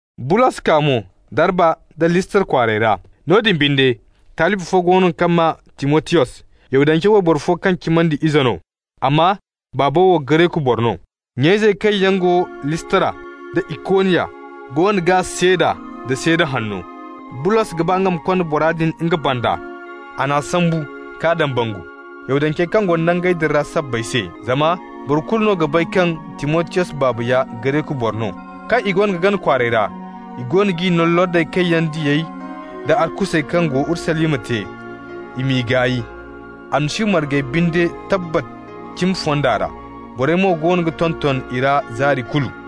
Bulos kaa mo Darba nda Listra kwaarey ra. Noodin binde, talibi fo go no kaŋ maa Timotiyos. Yahudance wayboro fo kaŋ cimandi ize no, amma baabo wo Gareku boro no. Nya-izey kaŋ yaŋ go Listra da Ikoniya goono g'a seeda nda seeda hanno. Bulos ga ba nga ma konda bora din nga banda. A n'a sambu ka dambangu, Yahudancey kaŋ go nangey din ra sabbay se, zama boro kulu no ga bay kaŋ Timotiyos baaba ya Gareku boro no. Kaŋ i goono ga gana kwaarey ra, i goono g'i no lordey kaŋ yaŋ diyey da arkusey kaŋ go Urusalima te, i m'i gaay. Almasihu margey binde tabbat cimi fonda ra, borey mo goono ga tonton i ra zaari kulu.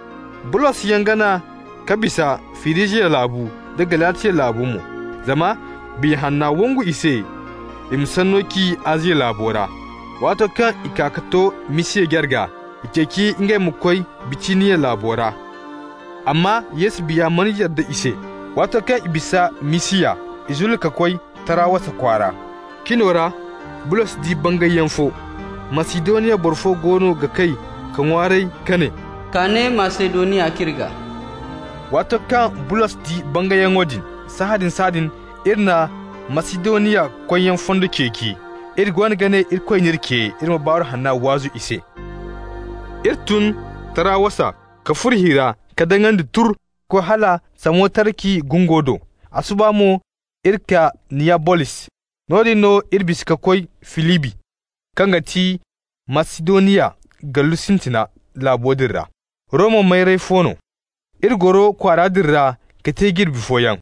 Bulosyaŋ gana ka bisa Firijiya laabu, da Galatiya laabu mo, zama Biya Hanna wangu i se i ma sanno ci Aziya laabo ra. Waato kaŋ i kaa ka to Misiya jarga, i ceeci ngey ma koy Bitiniya laabo ra, amma Yesu Biya mana yadda i se. Waato kaŋ i bisa Misiya, i zulli ka koy Tarawasa kwaara. Cino ra Bulos di bangayyaŋ fo: Masidoniya boro fo goono ga kay ka ŋwaaray ka ne: «Kaa ne Masidoniya k'iri gaa.» Waato kaŋ Bulos di bangayyaŋo din, sahãadin-sahãadin iri na Masidoniya koyyaŋ fondo ceeci. Iri goono ga ne Irikoy n'iri ce, iri ma Baaru Hanna waazu i se. Iri tun Tarawasa ka furo hi ra ka daŋandi turr ka koy hala Samotaraki gungo do, a suba mo iri kaa Niyabolis. Noodin no iri bisa ka koy Filibi, kaŋ ga ti Masidoniya gallu sintina laabo din ra, Roma mayray fo no. Iri goro kwaara din ra ka te jirbi fooyaŋ.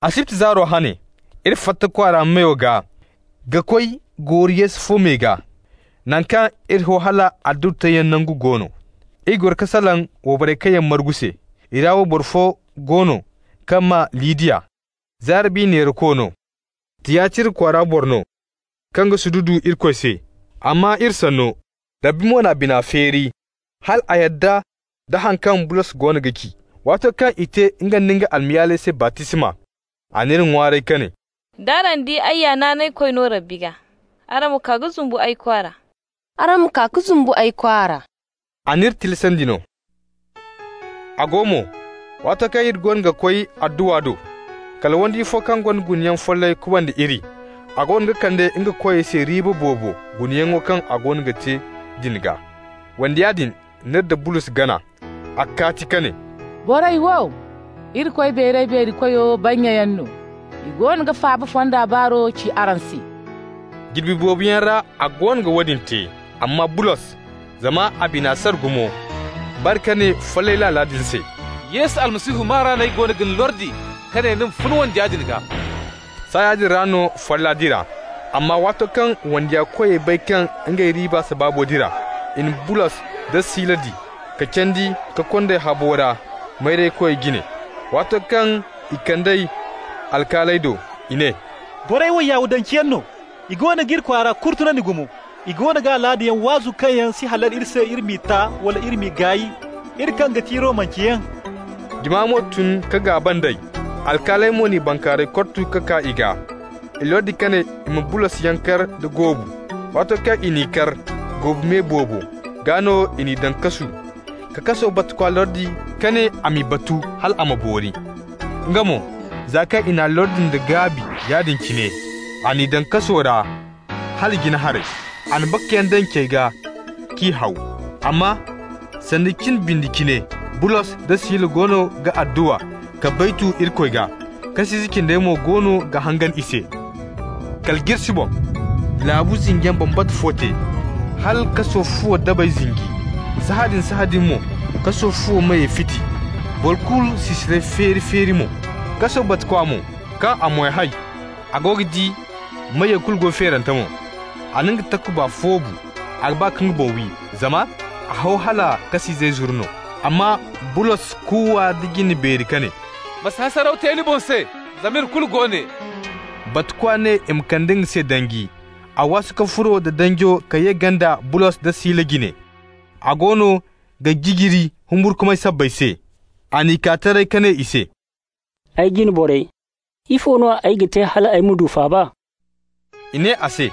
Asibti zaaro hane, iri fatta kwaara meyo gaa ka koy gooru yeesa fo me gaa, naŋ kaŋ iri ho hal adduwa teeyaŋ nangu go no. Iri goro ka salaŋ wayborey kaŋ yaŋ margu se. I ra wayboro fo go no kaŋ maa Lidiya. Zaara bi neerako no, Tiyatira kwaara boro no, kaŋ ga sududu Irikoy se. A maa iri sanno, Rabbi mo n'a bina feeri hal a yadda nda haŋ kaŋ Bulos goono ga ci. Waato kaŋ i te nga nda nga almayaaley se baptisma, a n'iri ŋwaaray ka ne: «D'araŋ di ay ya naanaykoy no Rabbi gaa, araŋ ma kaa ka zumbu ay kwaara.» A n'iri tilasandi no. A go mo, waato kaŋ iri goono ga koy adduwa do, kala wandiya fo kaŋ gonda gunayaŋ follay kubanda iri. A goono ga kande nga koyey se riiba boobo gunayaŋo kaŋ a goono ga te din gaa. Wandiya din n'iri da Bulos gana. A kaati ka ne: «Borey wo, Irikoy Beeray-Beeri-Koyo bannyayaŋ no. I goono ga faaba fondo baaro ci araŋ se.» Jirbi boobo yaŋ ra a goono ga woodin te. Amma Bulos, zama a bina sara gumo, bare ka ne follay laala din se: «Yesu Almasihu maa ra no ay goono ga ni lordi ka ne ni ma fun wandiya din gaa!» Saaya din ra no folla dira. Amma waato kaŋ wandiya koyey bay kaŋ ngey riiba sabaabo dira, i na Bulos da Sila di, ka candi ka kond'ey habo ra mayraykoy jine. Waato kaŋ i kand'ey alkaaley do, i ne: «Borey wo Yahudanceyaŋ no, i goono g'iri kwaara kurtunandi gumo. I goono ga alaadayaŋ waazu kaŋ yaŋ si halal iri se iri m'i ta, wala iri m'i gaay, iri kaŋ ga ti Romanceyaŋ.» Jama mo tun ka gaaba nd'ey. Alkaaley mo n'i bankaarayey kortu ka kaa i gaa. I lordi ka ne i ma Bulosyaŋ kar da goobu. Waato kaŋ i n'i kar goobu me boobo, gaa no i n'i daŋ kasu ka kaso batukwa lordi ka ne a m'i batu hal a ma boori. Nga mo, za kaŋ i n'a lordi nda gaabi yaadin cine, a n'i daŋ kaso ra hala jina haray. A na bakayaŋ daŋ cey gaa k'i haw. Amma sanda cin bindi cine, Bulos da Sila goono ga adduwa ka baytu Irikoy gaa, kas'ize cindey mo goono ga hangan i se. Kala jirsi boŋ, laabu zinjiyaŋ bambata fo te, hala kaso fuwo dabey zinji. Sahãadin-sahãadin mo kaso fuwo meyey fiti, boro kulu sisirey feeri-feeri mo. Kaso batukwa mo, kaŋ a mo hay, a go ga di meyey kulu go feerante mo, a na nga takuba foobu. A ga ba ka nga boŋ wi, zama a ho hala kas'izey zuru no. Amma Bulos kuuwa da jinde beeri ka ne: «Ma si hasaraw te ni boŋ se, zama iri kulu go ne.» Batukwa ne i ma kande nga se danji. A waasu ka furo nda danjo ka ye ganda Bulos da Sila jine. A goono ga jijiri humburkumay sabbay se. A n'i kaa taray ka ne i se: «Ay jine borey, ifo no ay ga te hal ay ma du faaba?» I ne a se: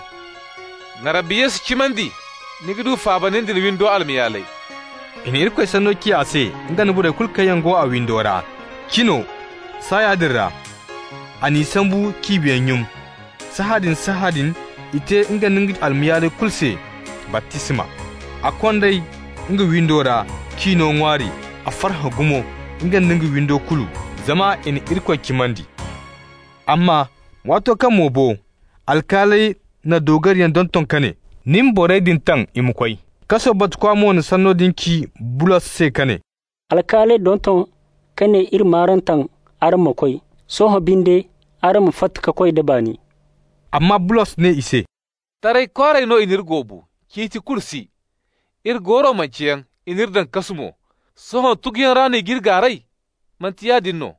«Ma Rabbi Yesu cimandi, ni ga du faaba, nin da ni windo almayaaley.» I na Irikoy sanno ci a se, nga nda borey kulu kaŋ yaŋ go a windo ra. Cino saaya din ra, a n'i sambu k'i biyey nyum. Sahãadin-sahãadin, i te nga nda nga almayaaley kulu se baptisma. A kond'ey nga windo ra k'i no ŋwaari. A farhã gumo, nga nda nga windo kulu, zama i na Irikoy cimandi. Amma waato kaŋ mo bo, alkaaley na doogariyaŋ donton ka ne: «Ni ma borey din taŋ i ma koy.» Kaso batukwa mo na sanno din ci Bulos se ka ne: «Alkaaley donton ka ne i m'araŋ taŋ araŋ ma koy. Sohõ binde, araŋ ma fatta ka koy da baani.» Amma Bulos ne i se: «Taray kwaaray no i n'iri goobu, ciiti kulu si. Iri go mo Romanceyaŋ, i n'iri daŋ kasu mo. Sohõ tuguyaŋ ra no i g'iri gaaray? Manti yaadin no!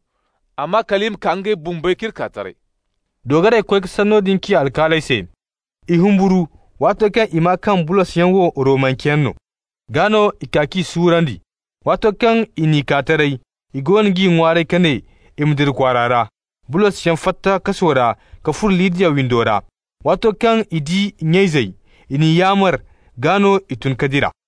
Amma kal i ma kaa ngey bumbey k'iri kaa taray.» Doogarey koy ka sanno din ci alkaaley se. I humburu waato kaŋ i maa kaŋ Bulosyaŋ wo Romanceyaŋ no. Gaa no i kaa k'i suurandi. Waato kaŋ i n'i kaa taray, i goono g'i ŋwaaray ka ne i ma dira kwaara ra. Bulosyaŋ fatta kaso ra ka furo Lidiya windo ra. Waato kaŋ i di nya-izey, i n'i yaamar. Gaa no i tun ka dira.